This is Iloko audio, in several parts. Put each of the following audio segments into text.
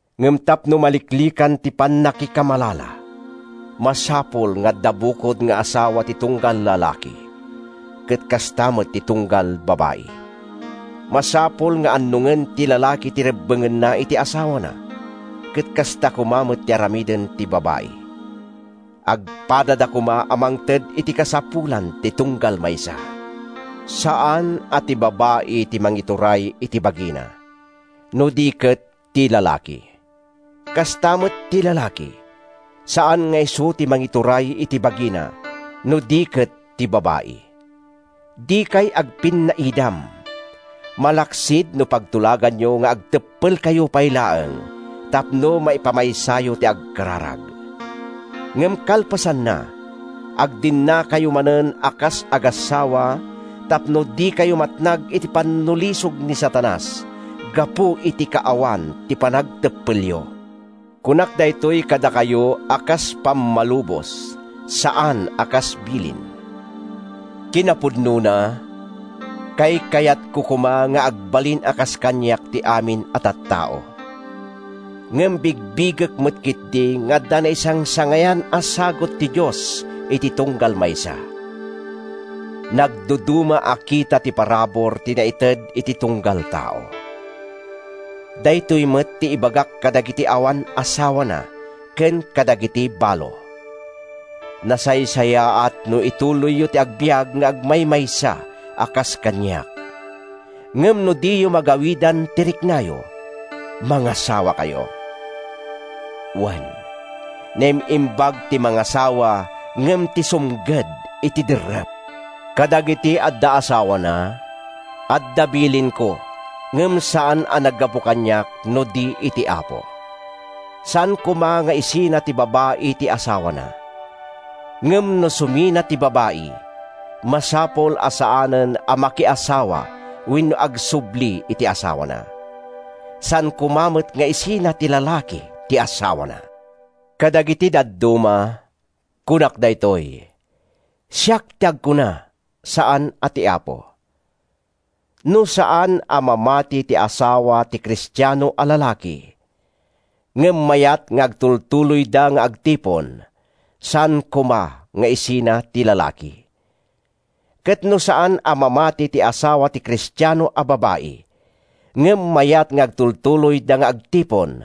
Ngem tapno maliklikan ti pannakikamalala, masapul nga adda bukod nga asawa ti tunggal lalaki, ket kasta met ti tunggal babai. Masapul nga annongen ti lalaki ti rebbengna iti asawana, ket kasta koma met ti aramiden ti babai. Agpadada koma a mangted iti kasapulan ti tunggal maysa. Saan a ti babai ti mangituray iti bagina, no di ket ti lalaki. Kasta met ti lalaki, saan nga isu ti mangituray iti bagina, no di ket ti babai. Dikay agpinnaidam, malaksid no pagtulaganyo nga agteppelkayo pay laeng tapno maipamaysayo ti agkararag. Ngem kalpasanna, agdennakayo manen a kas agassawa tapno dikayo matnag iti pannulisog ni Satanas gapu iti kaawan ti panagteppelyo. Kunak daytoy kadakayo a kas pammalubos, saan a kas bilin. Kinapudnona, kaykayatko koma nga agbalin a kas kaniak ti amin a tattao. Ngem bigbigek met ketdi nga adda naisangsangayan a sagut ti Dios iti tunggal maysa. Nagduduma a kita ti parabur ti naited iti tunggal tao. Daytoy met ti ibagak kadagiti awan asawana ken kadagiti balo: Nasaysayaat no ituloyyo ti agbiag nga agmaymaysa a kas kaniak. Ngem no diyo magawidan ti riknayo, mangasawakayo. Wen, naim-imbag ti mangasawa ngem ti sumged iti derrep. Kadagiti adda asawana, adda bilinko ngem saan a naggapu kaniak no di iti Apo: Saan koma nga isina ti babai ti asawana. Ngem no sumina ti babai, masapul a saanen a makiasawa wenno agsubli iti asawana. Saan koma met nga isina ti lalaki ti asawana. Kadagiti dadduma, kunak daytoy—siak ti agkuna, saan a ti Apo: No saan a mamati ti asawa ti Kristiano a lalaki, ngem mayat nga agtultuloyda nga agtipon, saan koma nga isina ti lalaki. Ket no saan a mamati ti asawa ti Kristiano a babai, ngem mayat nga agtultuloyda nga agtipon,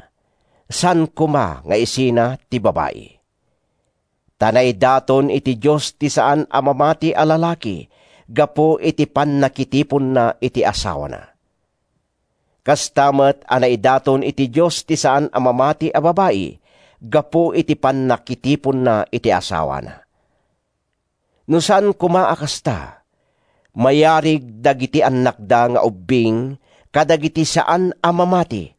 saan koma nga isina ti babai. Ta naidaton iti Dios ti saan a mamati a lalaki gapu iti pannakitiponna iti asawana. Kasta met a naidaton iti Dios ti saan a mamati a babai gapu iti pannakitiponna iti asawana. No saan koma a kasta, mayarig dagiti annakda nga ubbing kadagiti saan a mamati,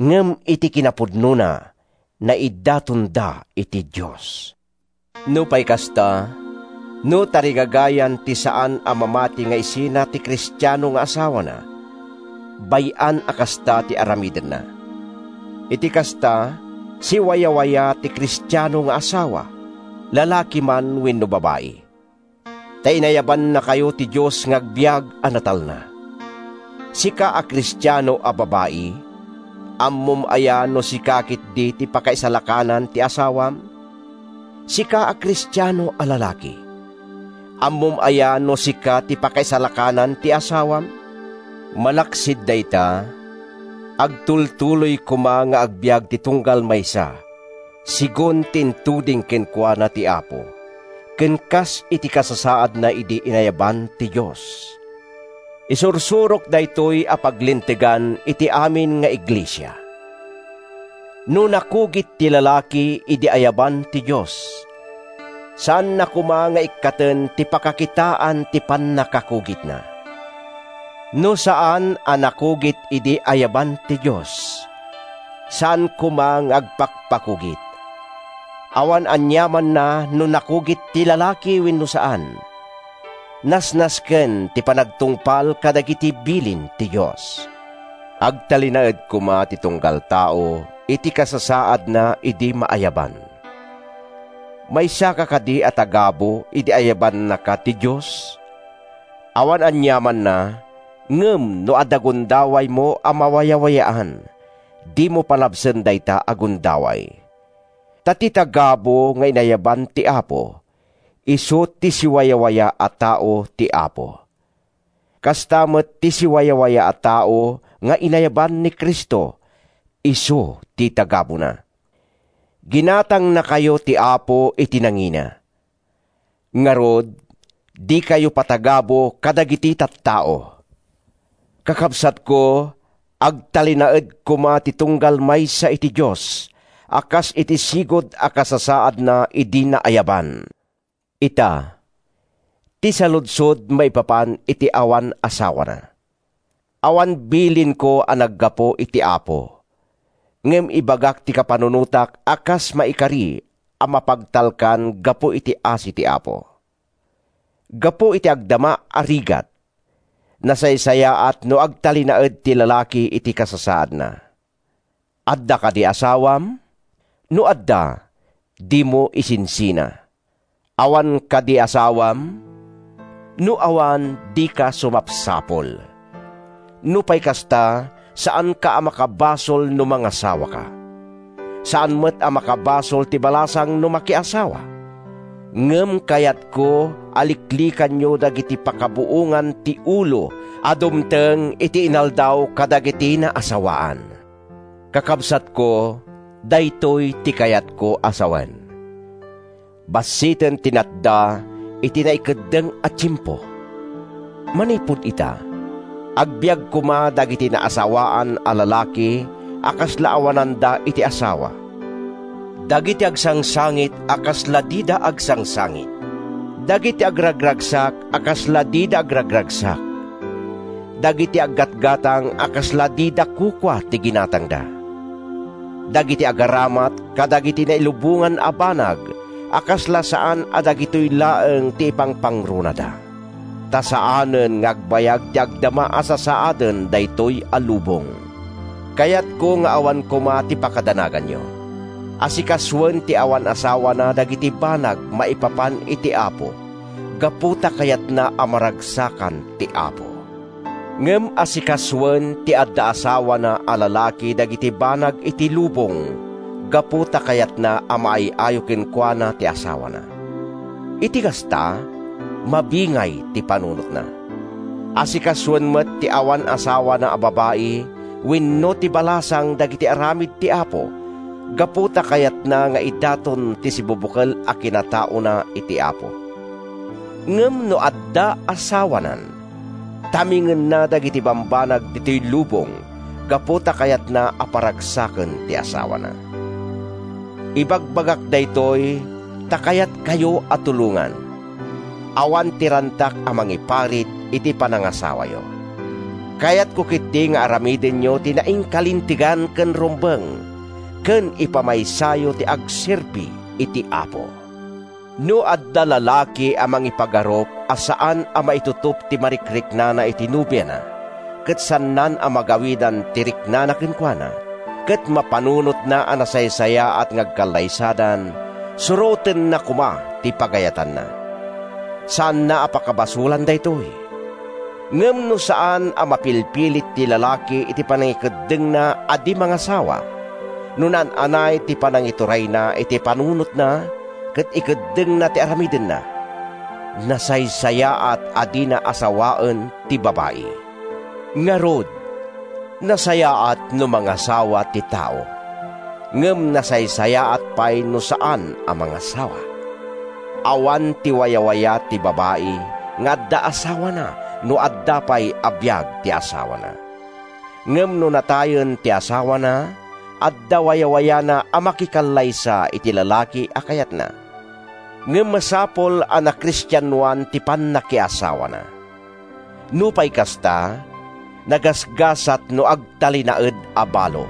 ngem iti kinapudnona, naidatonda iti Dios. Nupay kasta, no tarigagayan ti saan a mamati nga isina ti Kristiano nga asawana, bay-an a kasta ti aramidenna. Iti kasta, siwayawaya ti Kristiano nga asawa, lalaki man wenno babai. Ta inayabannakayo ti Dios nga agbiag a natalna. Sika a Kristiano a babai, ammom aya no sika ketdi ti pakaisalakanan ti asawam? Sika a Kristiano a lalaki, ammom aya no sika ti pakaisalakanan ti asawam? Malaksid dayta, agtultuloy koma nga agbiag ti tunggal maysa segun ti intuding kenkuana ti Apo, ken kas iti kasasaadna idi inayaban ti Dios. Isursurok daytoy a paglintegan iti amin nga iglesia. No nakugit ti lalaki idi ayaban ti Dios, saanna koma nga ikkaten ti pakakitaan ti pannakakugitna. No saan a nakugit idi ayaban ti Dios, saan koman nga agpakpakugit. Awan aniamanna no nakugit ti lalaki wenno saan. Nasnasken ti panagtungpal kadagiti bilin ti Dios. Agtalinaed koma ti tunggal tao iti kasasaadna idi maayaban. Maysaka kadi a tagabu idi ayabannaka ti Dios? Awan aniamanna, ngem no adda gundawaymo a mawayawayaan, dimo palabasen dayta a gundaway. Ta ti tagabu nga inayaban ti Apo, isu ti siwawaya a tao ti Apo. Kasta met ti siwawaya a tao nga inayaban ni Cristo, isu ti tagabuna. Ginatangnakayo ti Apo iti nangina. Ngarud, dikayo patagabu kadagiti tattao. Kakabsatko, agtalinaed koma ti tunggal maysa iti Dios a kas iti sigud a kasasaadna idi naayaban. Ita, ti saludsod maipapan iti awan asawana: Awan bilinko a naggapu iti Apo, ngem ibagak ti kapanunotak a kas maikari a mapagtalkan gapu iti asi ti Apo. Gapu iti agdama a rigat, nasaysayaat no agtalinaed ti lalaki iti kasasaadna. Adda kadi asawam? No adda, dimo isinsina. Awan kadi asawam? No awan, dika sumapsapul. Nupay kasta, saanka a makabasol no mangasawaka. Saan met a makabasol ti balasang no makiasawa. Ngem kayatko a liklikanyo dagiti pakabuongan-ti-ulo a dumteng iti inaldaw kadagiti naasawaan. Kakabsatko, daytoy ti kayatko a sawen: Bassiten ti natda iti naikeddeng a tiempo. Manipud ita, agbiag koma dagiti naasawaan a lalaki a kasla awananda iti asawa; dagiti agsangsangit a kasla dida agsangsangit; dagiti agragragsak a kasla dida agragragsak; dagiti aggatgatang a kasla dida kukua ti ginatangda; dagiti agaramat kadagiti nailubongan a banag a kasla saan a dagitoy laeng ti ipangpangrunada. Ta saanen nga agbayag ti agdama a sasaaden daytoy lubong. Kayatko nga awan koma ti pakadanaganyo. Asikasoen ti awan asawana dagiti banag maipapan iti Apo gapu ta kayatna a maragsakan ti Apo. Ngem asikasoen ti adda asawana a lalaki dagiti banag iti lubong gapu ta kayatna a maay-ayo kenkuana ti asawana. Iti kasta, mabingay ti panunotna. Asikasoen met ti awan asawana a babai wenno ti balasang dagiti aramid ti Apo gapu ta kayatna nga idaton ti sibubukel a kinataona iti Apo. Ngem no adda asawanan, tamingenna dagiti bambanag ditoy lubong gapu ta kayatna a paragsaken ti asawana. Ibagbagak daytoy ta kayatkayo a tulongan. Awan ti rantak a mangiparit iti panangasawayo. Kayatko ketdi nga aramidenyo ti nainkalintegan ken rumbeng, ken ipamaysayo ti agserbi iti Apo. No adda lalaki a mangipagarup a saan a maitutop ti marikriknana iti nobiana ket saannan a magawidan ti riknana kenkuana, ket mapanunotna a nasaysayaat nga agkallaysadan, surotenna koma ti pagayatanna. Saanna a pakabasolan daytoy. Ngem no saan a mapilpilit ti lalaki iti panangikeddengna a di mangasawa, no naan-anay ti panangiturayna iti panunotna ket ikeddengna ti aramidenna, nasaysayaat a dina asawaen ti babai. Ngarud, nasayaat no mangasawa ti tao, ngem nasaysayaat pay no saan a mangasawa. Awan ti wayawaya ti babai nga adda asawana no adda pay a biag ti asawana. Ngem no natayen ti asawana, adda wayawayana a makikallaysa iti lalaki a kayatna. Ngem masapul a nakristianoan ti pannakiasawana. Nupay kasta, nagasgasat no agtalinaed a balo.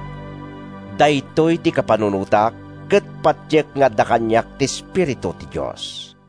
Daytoy ti kapanunotak, ket patiek nga adda kaniak ti Espiritu ti Dios.